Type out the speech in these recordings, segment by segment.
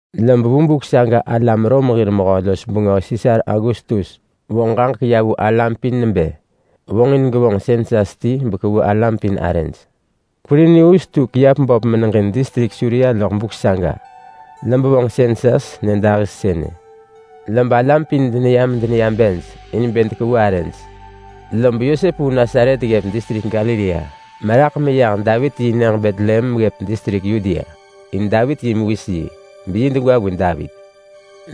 Lob vu buk saga alam Rom hir mehö-los-bengö Sisar Augustus vonġ ġaġek ya vu alam pin nebë vonġin gevonġ sensas ti bekevu alam pin arëj. Kwirinius tu kiap böp meneġin distrik Suria loḳ buk saga, lob vonġ sensas nyëdahis sënë. Lob alam pin deneya medeneya bej in bë dekevu arëj. Lob Yosep vu Nasaret ggëp distrik Galilea meraḳ meyah Davit yi nyëġ Betlehem ggëp distrik Yudea, in Davit yi mewis yi, beyi degwa vu Davit.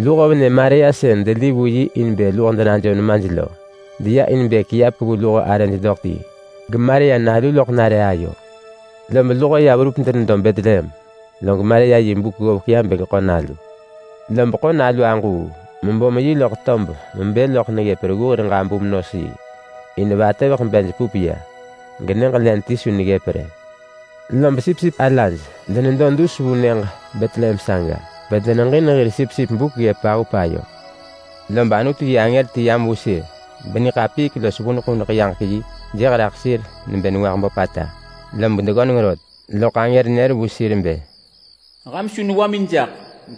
Luho venë Maria sën deli vu yi in bë luho denajom nemaj lo, deya in bë kiap kevu luho arëj doḳ ti. GeMaria nalu loḳ nare ayo. Lob luho ya verup denedo Betlehem, log Maria yi buk ggovek ya bë geḳo nalu. Lob ḳo nalu aġuu mebom yi loḳ tob mebë loḳ neggëp reggu hir ġabum-nos-yi, in vatëveḳ bej pup ya genyëġ len ti su neggëp rë. Lob sipsip alaj denedo dus vu nyëġ Betlehem saga bedeneġin hir sipsip buk ggëp pahup ayo. Lob Anutu yi angër ti yam vu sir, beniḳapiik los vuneḳ vuneḳ yaġek yi jëh raḳ sir nebë nengwah böpata, lom deggöneng rot. Loḳ angër nër vu sir bë, “Ham su newamin jaḳ!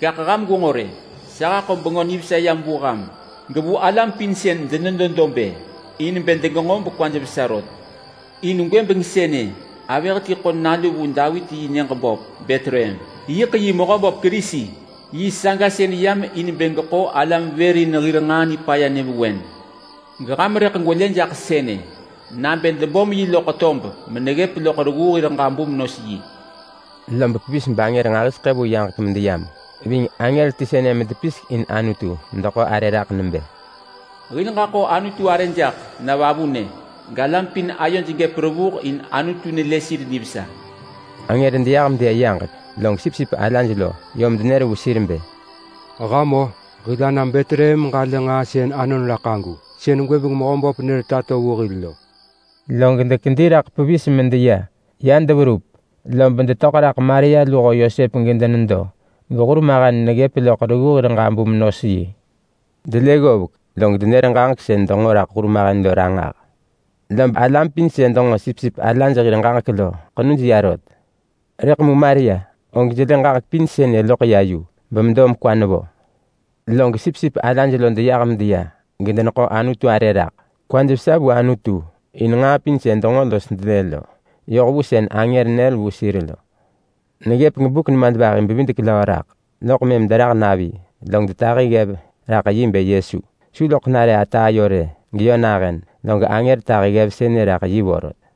Gaḳ ham gwenġo rë! Sa haḳo Bengö Nivesa yam vu ham, gevu alam pin sën denedo dob-ë, in bë degenġo bekwaj vesa rot. In gwëbeng sënë avëh ti ḳo nalu vu Davit yi nyëġ böp Betlehem. Yiḳ yi Mehöböp Kerisi. Yi saga sën yam in bë geḳo alam vër in hir nġaa nipaya nyëvewen. Geham rëḳ gwelë jaḳ sënë nabë debom yi loḳ tob meneggëp loḳ reggu hir ġabum-nos-yi.” Lob pevis bangër nġahiseḳë vu yaġek medeyam ving angër ti sënë medepisek in Anutu medeḳo arë raḳ nebë, “Hil ġaḳo Anutu arë jaḳ na vavunë! Galam pin ayoj gëp revuh in Anutu nelë sir nivesa.” Angër deyah medeya yaġek, log sipsip alaj lo yom denër vu sir bë, “Ham-o! Hil ana Betlehem meġalë nġaa sën anon raḳ agu, sën gwëbeng Mehöböp nër tato vu hil lo.” Log dekedi raḳ pevis medeya. Ya deverup, lob detöḳ raḳ Maria luho Yosep gedenedo, gehurmahen neggëp loḳ reggu hir ġabum-nos-yi. Delë ggovek, log denër ġaġek sën denġo raḳ hurmahen lo ranġah. Lob alam pin sën denġo sipsip alaj hir ġaġek lo ḳenuj ya rot. Rëḳ mu Maria, og jelë ġaġek pin sënë loḳ ya yu bemedo mekwa nevo. Log sipsip alaj lo deyah medeya, gedeneḳo Anutu arë raḳ. Kwaj vesa vu Anutu in nġaa pin sën denġo los delë lo, yoh vu sën angër nër vu sir lo. Neggëp gebuk nemadvahi-bevidek-löö raḳ, loḳ mëm derah navi, log detahi ggev raḳ yi bë Yesu. Su loḳ nare ata ayo rë geyö nahën, log angër tahi ggev sënë raḳ yi vorot.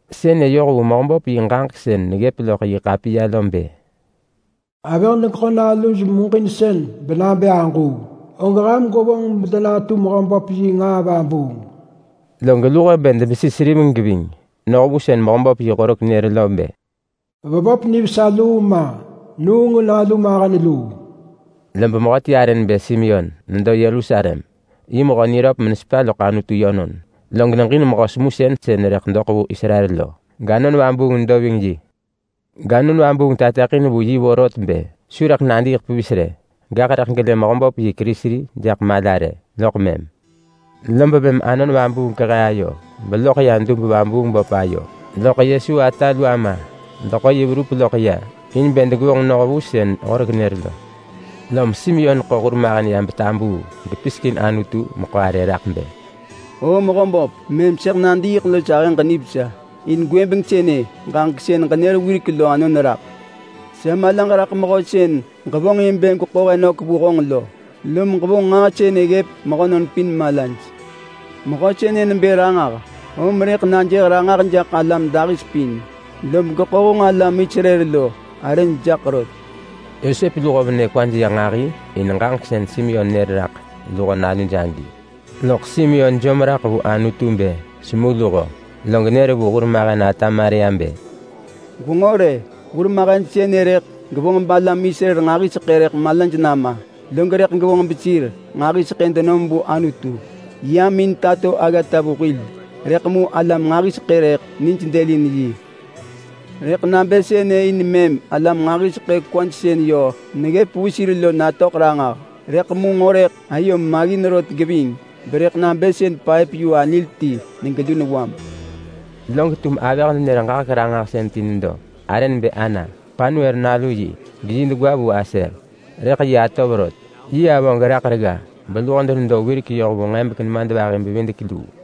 Sënë yoh vu Mehöböp yi ġaġek sën neggëp loḳ yi ḳapiya lo bë: Avëh degeḳo naluj muġinsën, benabë aġuu, og ham gwevonġ bedenatu Mehöböp yi nġaa vabuung. Log luho bë debesi seriveng geving, noh vu sën Mehöböp yi horek nër lo bë: Vevop nivesa luu ma, nuung nalu mewis luu. Lob mehöti arë nebë Simeon nedo Yerusalem. Yi mehö niröp menesepa loḳ Anutu yönon, log neġin mehö semusën sën rëḳ doḳ vu Israel lo. GAnon Vabuung nedo ving yi. GAnon Vabuung tateḳin vu yi vorot bë su rëḳ nadiiḳ pevis rë, gaḳ rëḳ gelë Mehöböp yi Kerisi jaḳ mala rë, loḳ mëm. Lob mëm Anon Vabuung kehe ayo beloḳ ya dub-vabuung-böp ayo, loḳ Yesu ata lu ama deḳo yi verup loḳ ya in bë degevonġ noh vu sën horek nër lo. Lom Simeon ḳo hurmahen ya betabuu gepisek in Anutu meḳo arë raḳ bë: “O Mehöböp, mëm sëḳ nadiiḳ los ahëġ nivesa, in gwëbeng sënë ġaġek sën ġenër wirek lo anon raḳ. Sa malaġ raḳ mehö sën ġevonġ in bë gweḳo he nök vu honġ lo. Lom ġevonġ nġaa sënë ggëp mehönon pin malaj. Mehö sënë nebë ranġah, om rëḳ najëh ranġah jaḳ alam dahis pin, lob geḳo honġ alam Israel lo arëj jaḳ rot.” Yosep luho venë kwaj ya nġahi in ġaġek sën Simeon nër raḳ luho naluj agi. Loḳ Simeon jom raḳ vu Anutu bë semu luho, log nër vu hurmahen ata Maria bë, “Gwenġo rë, hurmahen sënë rëḳ gevonġ balam Israel nġahiseḳë rëḳ malaj nama, log rëḳ gevonġ besir nġahiseḳë denom vu Anutu. Yam in tato aggata vu hil, rëḳ mu alam nġahiseḳë rëḳ nij dëlin yi. Rëḳ nabë sënë in mëm alam nġahiseḳë kwaj sën yö neggëp vu sir lo natöḳ ranġah. Rëḳ mu nġo rëḳ ayom maggin rot geving berëḳ nabë sën paëp-yu-anil ti negelu newam.” Log tum avëh-nenër-ġaġek-ranġahsën ti nedo, arë nebë Ana. Panuel nalu yi, geyi degwa vu Aser, rëḳ yi atov rot. Yi avö geraḳ regga beluho denedo wirek yoh vu nġebek nemadvahi-bevidek-luu,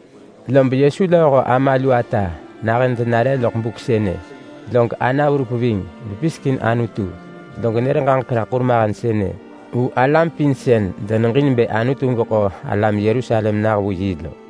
Lob Yesu lööho ama lu ata nahën denare loḳ buk sënë, log Ana verup ving bepisek in Anutu, log nër ġaġek raḳ hurmahen sënë vu alam pin sën deneġin bë Anutu geḳo alam Yerusalem nah vu yi lo.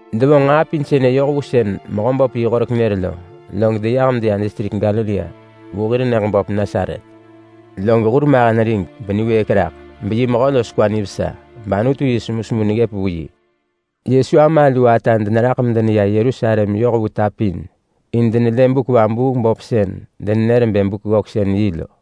Devonġ nġaa pin sënë yoh vu sën Mehöböp yi horek nër lo, log deyah medeya distrik Galilea vu hir nyëġ böp Nasaret lo. Log hurmahen rig beniwëëk raḳ. Beyi mehö los kwa nivesa, bAnutu yi semusemu neggëp vu yi. Yesu ama lu ata deneraḳ medeneya Yerusalem yoh vu ta pin medenelë buk vabuung böp sën denenër bë Buk-ggöksën-yi lo.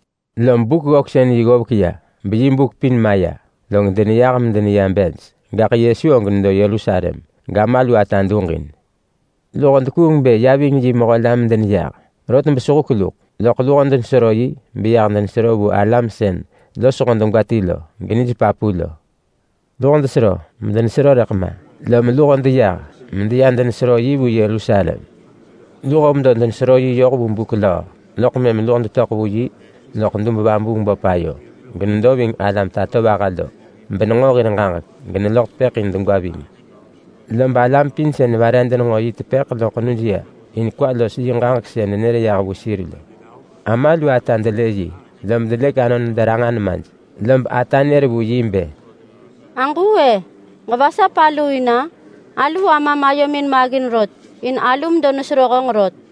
Lob Buk-ggöksën-yi ggovek ya, beyi buk pin maya, log deneyah medeneya bej. Gaḳ Yesu og nedo Yerusalem, gama lu ata duġin. Luho dekuung bë ya ving yi mehö la medeneya. Rot besehuk luḳ, loḳ luho denesero yi beya denesero vu alam sën losho degwa ti lo, genij papu lo. Luho desero medenesero rëḳ ma. Lom luho deyah medeya denesero yi vu Yerusalem. Luho medo denesero yi yoh vu buk löö, loḳ mëm luho detöḳ vu yi loḳ dub-vabuung-böp ayo, genedo ving alam tatovaha lo, benenġo hir ġaġek, geneloḳ tepëḳ in degwa ving. Lob alam pin sën vare denenġo yi tepëḳ lo ḳenuj ya in kwa los yi ġaġek sën nenër yah vu sir lo. Ama lu ata delë yi, lob delëk anon mederanġa nemaj. Lob ata nër vu yi bë, “Aġuu-e? Ġevasap aluu in-a? Alu amam ayomin maggin rot in alu medo nesero honġ rot.”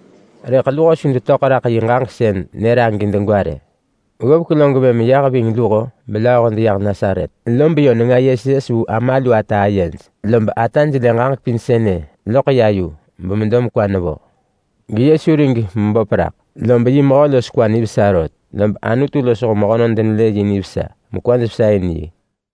Rëḳ luho su kwaj töḳ raḳ yi ġaġek sën nër agi degwa rë. Ggovek log mëm yah ving luho belööho deyah Nasaret, lob yö nenga yes yes vu ama lu ata ayej. Lob ata jelë ġaġek pin sënë loḳ ya yu bemedo mekwa nevo. GeYesu rig meböp raḳ, lob yi Mehö los kwa nivesa rot. Lob Anutu losho mehönon denelë yi nivesa, mekwaj vesa in.